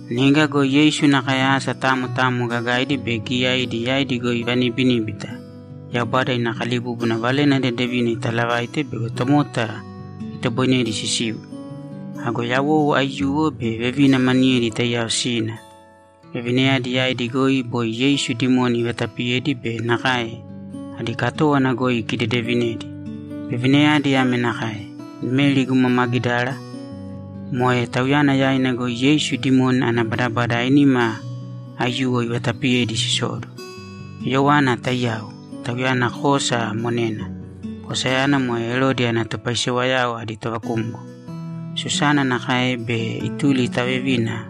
Niga go Yeisu nakae asa tamo tamo gagaidi be giyaidi yaidi goi ivanibiníbita, Yaubada ina kalibúbuna Valena Dedevina itaalavaite bego tomota itoboinedi sisiu. Ago yawou aiyuwo be vevina maniyedi taiyao sina. Vevinayadi yaidi goi boi Yeisu dimoni ivatapiyedi be nakae adi katówana goi ikidedevinedi. Vevinayadi ame nakae: Meri guma Magidara. Moe tauyana yaina goi Yeisu dimoni ana badabada ainima aiyuwo ivatapiyedi sisowóduwo. Yoana taiyao. Tauyana Kudasi monena. Kudasiyana moe Erodi ana topaisewayao adi tovakumgo. Susana nakae be ituli ta vevina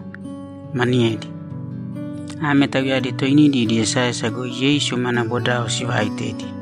maniyedi. Ame tauyadi toinidi idi esaesa goi Yeisu mana bodao sivaaitedi.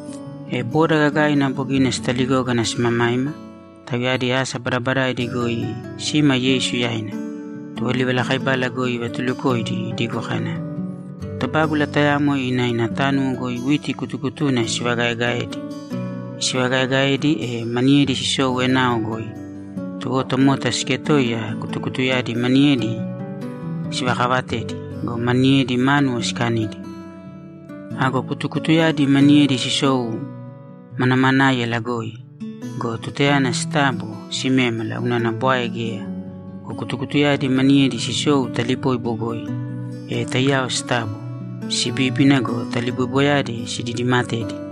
E boda gagaina bogina sitaligógana simamaima; tauyadi asa badabadaidi goi sima Yeisu yaina. Tuwo livalakaibala goi ivatulukoidi idigo kana, ‘Tobágula tayamo ina ina tánuwo goi witi kutukutuna isivagaegaedi. Isivagaaegaedi, e maniyedi sisou enao goi. Tuwo tomota siketoiya kutukutuyadi maniyedi sivakavatedi go, maniyedi, mánuwo sikanidi. Ago kutukutuyadi maniyedi sisou manamanáiyala goi go, tutayana sitabo, simémala unana bwae geya. Go kutukutuyadi maniyedi sisou taliboibo goi, e taiyao sitabo, sibíbina go, taliboiboyadi sididimatedi.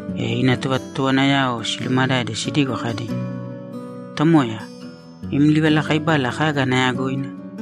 E ina tovatotowanayao silumadade sidigo kadi, ‘Tomoya, im livalakaibala kaga ana yagoina?’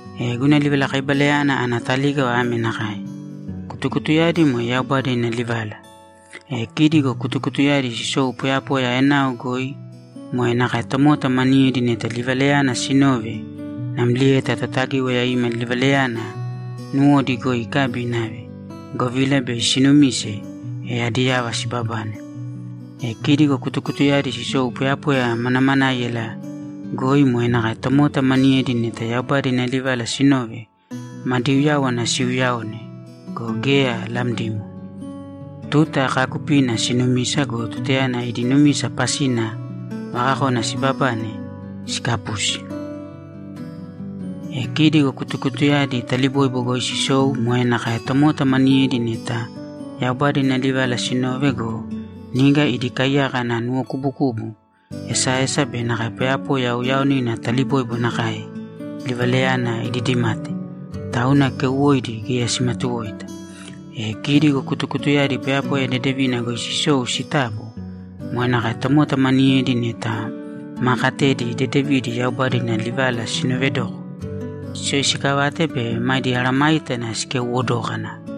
E guna livalakaibalayana ana talígava ame nakae: Kutukutuyadi moe Yaubada ina livala. E kidi go kutukutuyadi sisou poyapoya enao goi moe nakae tomota maniyedi neta livalayana sinove namlieta Totagíwaya ima livalayana nuwodi goi ikabi inave, govila bei sinumise, e adi yava sibabane. E kidi go kutukutuyadi sisou poyapoya manamanáiyala goi moe nakae tomota maniyedi neta Yaubada ina livala sinove, madi uyáwana siuuyaone go, geya lamdimo. Tuta kaakupina sinumisa go, tutayana idi numisa pasina vakakona sibabane, sikapusi. E kidi go kutukutuyadi taliboibo goi sisou moe nakae tomota maniyedi neta Yaubada ina livala sinove go, niga idi kaiyaka ana nuwokubukubu, esaesa be nakae poyapoya uyaonina taliboibo nakae livalayana sididimate, tauna keuwoidi geya simatuwoita. E kidi go kutukutuyadi poyapoya dedevina goi sisou sitabo, moe nakae tomota maniyedi neta ma katedi dedevidi Yaubada ina livala sinovedoko, siyoisikavate be madi meesayágana sikeuwo dókana.’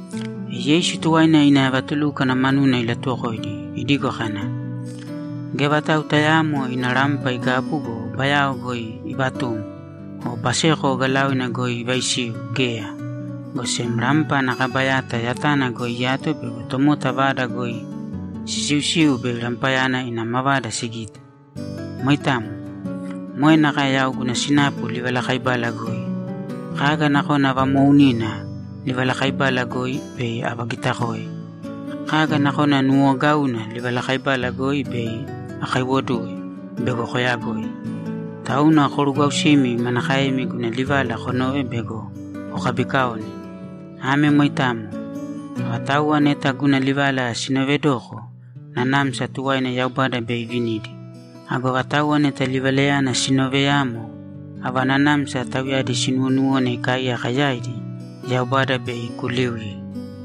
E Yeisu tuwaina ina vatulúkwana manuna ilatuwokoidi idigo kana, ‘Geya vatau tayaamo ina rampa igabu go, bayao goi ivatum o baseko ogalaoina goi ivaisiu geya, go sem rampa ana kaba yata yatana goi iyato bego tomota vada goi sisiusiu bei rampayana ina mavada sigite. Moitamo. Moe nakae yau guna sinapu livalakaibala goi. Kaga nakona vamoounina livalakaibala goi, bei avagitakoe. Kaga nakona nuuwogauna livalakaibala goi, bei akaiwoduwe bego koyagoi. Tauna korugwausīmi manakaemi guna livala konove bego kokabikaone. Ame moitamo. Avatauwa neta guna livala sinoovedoko, nanamsa tuwaina Yaubada bei ivinidi. Ago avatauwa neta livalayana sinooveyamo, ava nanamsa tauyadi sinuwonuwone ikaaiyaka yaidi, Yaubada bei ikuliuye.’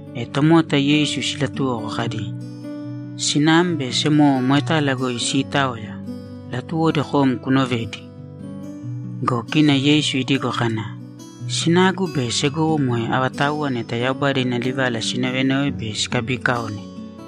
E tomota Yeisu silatuwoko kadi, ‘Sinam be semowo moetala goi siitaoya; latuwodi kom kunovedi.’ Go kina Yeisu idigo kana, ‘Sinagu be segowo moe avatauwa neta Yaubada ina livala sinovenove be sikabiikaone.’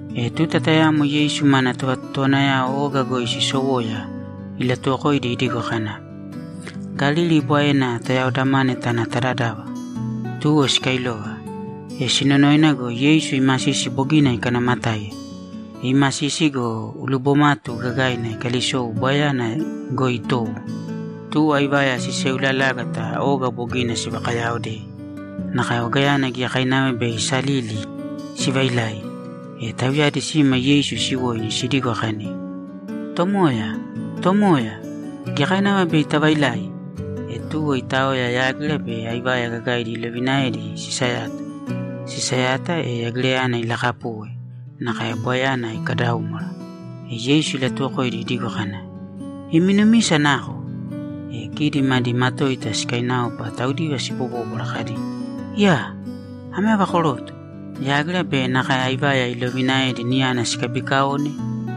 E tuta tayamo Yeisu mana tovatotowanayao oga goi sisowoya, ilatuwokoidi idigo kana, ‘Galili Bwaena tayaodamāne tāna ta dadava.’ Tuwo sikailova. E sinonoina go, Yeisu imasisi bogina ikanaamatáiya. Iimasisi go, ulibomatu gagaina ikalisou Bwaeyana goi itowo. Tuwo aivaya siseulalágata oga bogina sivakayaaodei, nakae ogayana giyakainava bei isalili sivailai. E tauyadi sima Yeisu siwoini sidigo kadi, ‘Tomooya, tomooya, giyakainava bei tavailai!’ E tuwo itaoya, yágira be aivaya gagaidi ilovinaedi sisayata. Sisayata, e yagirayana ilakapuwe nakae Bwaeyana ikadaúmwara. E Yeisu ilatuwokoidi idigo kana, ‘Imi numisa nako?’ E kidi madi matoita sikainaopa taudiva sibobóbwara kadi, ‘Iyaa! Ame ava koroto? Yágira be nakae aivaya ilovinaedi niyana sikabiikaone?’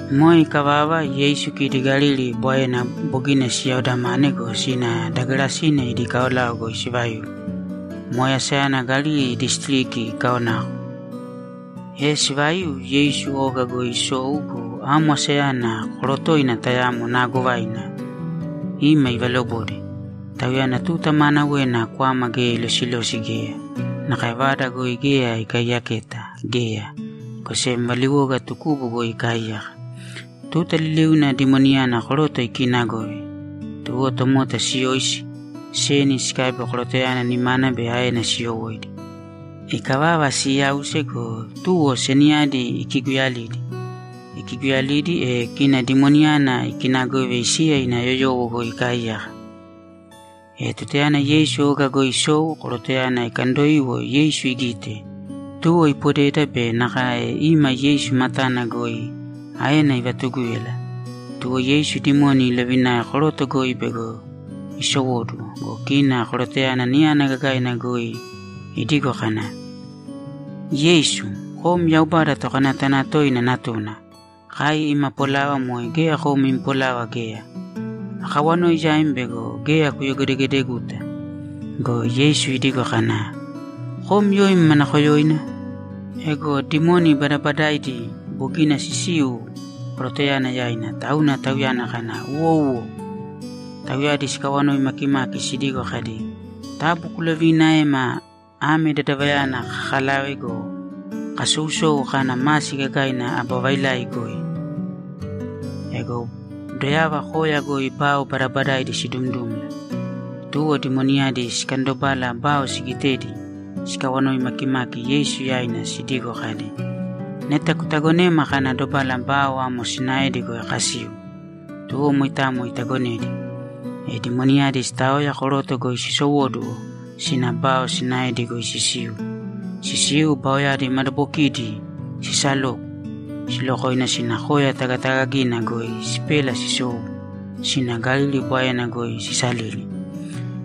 Moe ikavava, Yeisu kidi Galili Bwaena bogina siyaodamane go, sina da Gerasine idi kaolao goi sivaiu. Moe asayana Galili disitiriki ikaonako. E sivaiu, Yeisu oga goi isou go, amo asayana korotoina tayamo naagovaina ima ivalobode. Tauyana tuta maanawena kwama geya ilosilosi geya, nakae vada goi geya ikaiyaketa geya, go sem valiwoga tukubu goi ikaaiyaka. Tuta liliuna dimoniyana koroto ikiinagove. Tuwo tomota siyoisi, seni sikabi korotoyana nimana be aena siyowóidi. Ikavava, siiyause go, tuwo seniyadi ikiguyalidi. Ikiguyalidi, e kina dimoniyana ikinagove isiya ina yoyowo goi ikaaiyaka. E tutayana Yeisu oga goi isou, korotoyana ikandoiwo Yeisu igite, tuwo ipodeda be nakae ima Yeisu matana goi aena ivatugúyala. Tuwo Yeisu dimoni ilovinae koroto goi bego isowóduwo go, kina korotoyana niyana gagaina goi idigo kana, ‘Yeisu, kom Yaubada Tokanayatanatoina Natuna, kai ima polava moe geya kom im polava geya. Akawanoi yaim bego geya kuyogedegedeguta.’ Go Yeisu idigo kana, ‘Kom yoim manakoyoina?’ Ego dimoni badabadaidi bogina sisiu korotoyana yaina, tauna tauyana kana, ‘Uwouwo.’ Tauyadi sikawanoi makimaki sidigo kadi, ‘Taabu kuloviinaēma ame dadavayana kakalave go, kasousou kana masi gagaina aba vailai goi.’ Ego doyava koya goi bao badabadaidi sidumdumla. Tuwo dimoniyadi sikandobala bao sigitedi, sikawanoi makimaki Yeisu yaina sidigo kadi, ‘Neta kutagonēma kana dobala bao amo sinaedi goi kasiu.’ Tuwo moitamo itagonedi. E dimoniyadi sitaoya koroto goi sisowóduwo sina bao sinaedi goi sisiu. Sisiu, baoyadi madabokidi sisaloku, silokoina sina koya tagatagagina goi sipela sisou sina Galili Bwaena goi sisalili.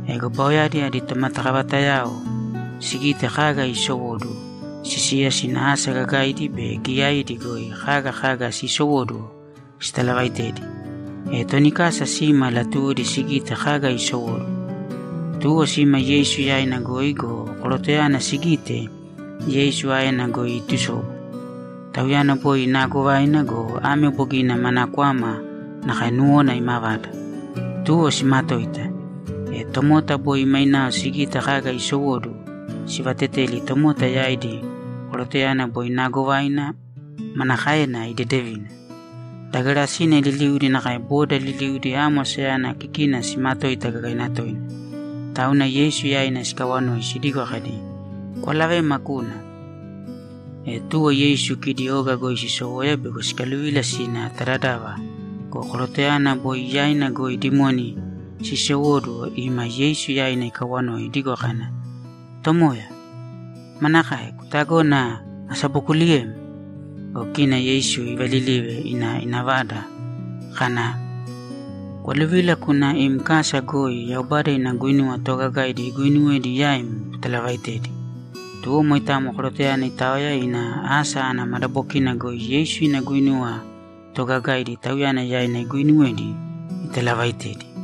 E baoyadi adi tomatakavatayao sigite kaga iisowóduwo, sisiya sina asa gagaidi be giyaidi goi kaga kaga siisowóduwo sitalavaitedi. E toni kasa sima latuwodi sigite kaga isowóduwo. Tuwo sima Yeisu yaina goi go, korotoyana sigite, Yeisu aena goi iitusobu. Tauyana boi naagovaina go, ame bogina mana kwama nakae nuwona imavada, tuwo simatoita. E tomota boi mainao sigite kaga iisowóduwo, sivateteli tomota yaidi korotoyana boi naagovaina manakaena idedevina. Da Gerasine liliudi nakae boda liliudi amo asayana kikina simatoita gagaina toina. Tauna Yeisu yaina sikawanoi sidigo kadi, ‘Kwalavēma kūna.’ E tuwo Yeisu kidi oga goi sisowoya bego sikaluvila sina ta dadava go, korotoyana boi yaina goi dimoni sisowóduwo ima Yeisu yaina ikawanoi idigo kana, ‘Tomoya, manakae? Kutagona asabokuliyem?’ Go kina Yeisu ivalilive ina ina vada kana, ‘Kwaluvīla kūna im kasa goi Yaubada ina guinuwa toogagaidi iguuinuwedi yaim kutalavaitēdi.’ Tuwo moitamo korotoyana itaoya ina asa ana madabokina goi Yeisu ina guinuwa toogagaidi tauyana yaina iguuinuwedi italavaaitedi.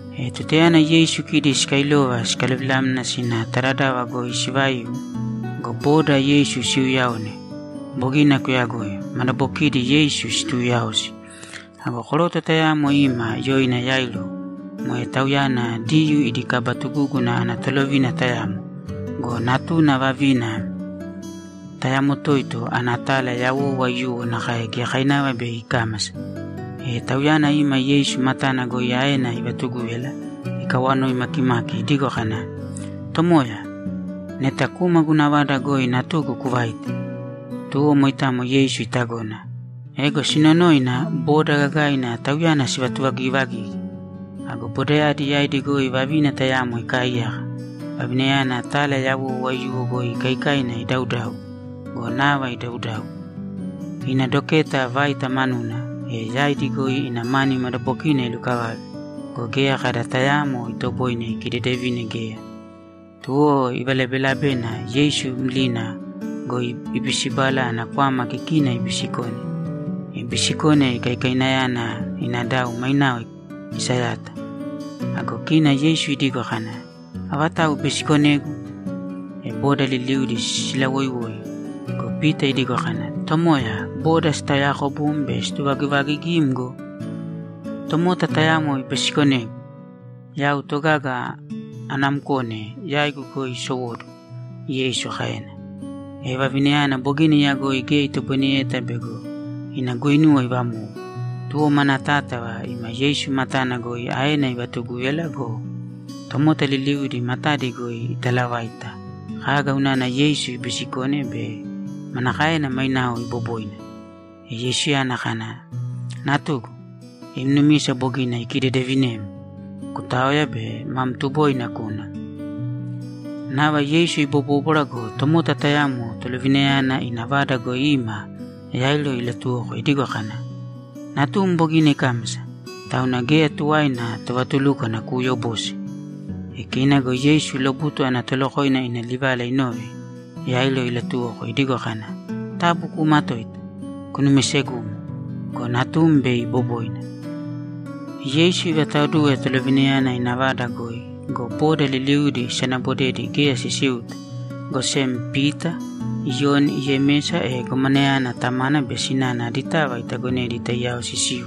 E tutayana Yeisu kidi sikailova sikaluvilamna sina ta dadava goi sivaiu go, boda Yeisu siuyaone. Bogina kuyagoi. Madabokidi Yeisu situuyaosi. Ago koroto tayamo ima yoina Yairo. Moe tauyana Diyuu idi kaba tugúguna ana tolovina tayamo go, natuna vavina tayamo toito ana tala yawou aiyuwo nakae giyakainava bei ikámasa. E tauyana ima Yeisu matana goi aena ivatugúyala ikawanoi makimaki idigo kana, ‘Tomoya, neta kūma guna vada goi natugu kuvāite.’ Tuwo moitamo Yeisu itagona. Ego sinonoina, boda gagaina Tauyana sivatuvagivagigi. Ago bodayadi yaidi goi vavina tayamo ikaaiyaka. Vavinayana tala yawou aiyuwo goi ikaikaina idaudau go, nava idaudau. Ina doketa vaita manuna, e yaidi goi ina mani madabokina ilukavave go, geya kada tayaamo itoboine ikidedevine geya. Tuwo ivalabelabena Yeisu mlina goi ibisibala ana kwama kikina ibisikone. Ibisikone, ikaikainayana ina dau mainao isayata. Ago kina Yeisu idigo kana, ‘Avatau ibisikonegu?’ E boda liliudi silawoiwoi go, Pita idigo kana, ‘Tomoya, boda sitaoyaakobum be sivatuvagivaagigim go!’ ‘Tomota tayamo ibisikonegu. Yau togaga anamkone yaigu goi isowóduwo’, Yeisu kaena. E vavinayana bogina iyagoi geya itoboineyeta bego ina guinuwa ivamou. Tuwo mana tátava ima Yeisu matana goi aena ivatugúyala go, tomota liliudi matadi goi italavaita kaga unana Yeisu ibisikone be manakaena mainao iboboina. E Yeisuyana kana, ‘Natugu, im numisa bogina ikidedevinem! Kutāoya be mam tuboina kūna.’ Nava Yeisu ibobóbwara go, tomota tayamo tolovinayana ina vada goi ima Yairo ilatuwoko idigo kana, ‘Natum bogina ikámasa, tauna geya tuwaina tovatulúkwana kuuyobose.’ E kina go Yeisu lobutu ana tolokoina ina livala inove, Yairo ilatuwoko idigo kana, ‘Taabu kuumatōita. Kunumisegūmo go, natum bei iboboina.’ E Yeisu ivataoduwe tolovinayana ina vada goi go, boda liliudi isanabodedi geya sisiuta, go sem Pita, Iyoni, Yemesa, e gomanayana tamana be sinana aditava itagonedi taiyao sisiu.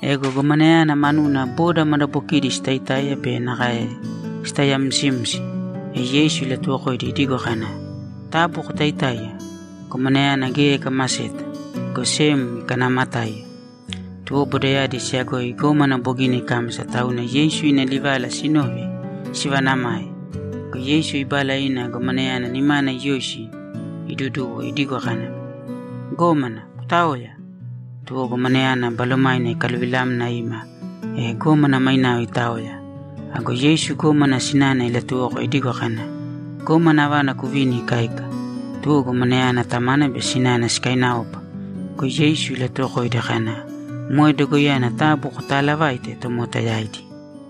Ego gomanayana manuna boda madabokidi sitaitáiya be nakae sitaiyamsimsi. E Yeisu ilatuwokoidi idigo kana, ‘Taabu kotaitāiya. Gomanayana geya ikamaseta, go sem ikanaamatáiya.’ Tuwo bodayadi siyagoi gómana bogina ikámasa, tauna Yeisu ina livalayana sinove, sivaanamae. Go Yeisu ibala ina gomanayana nimana iyoisi, iduduwo idigo kana, ‘Gómana, kutāoya!’ Tuwo gomanayana balomaina ikaluvilamna ima, e gómana mainao itaoya. Ago Yeisu gómana sinana ilatuwoko idigo kana, ‘Gómana avana kuvīni ikáika.’ Tuwo gomanayana tamana be sinana sikainaopa. Go Yeisu ilatuwokoidi kana, ‘Moe dogoiyana taabu kotaalavāite tomota yaidi.’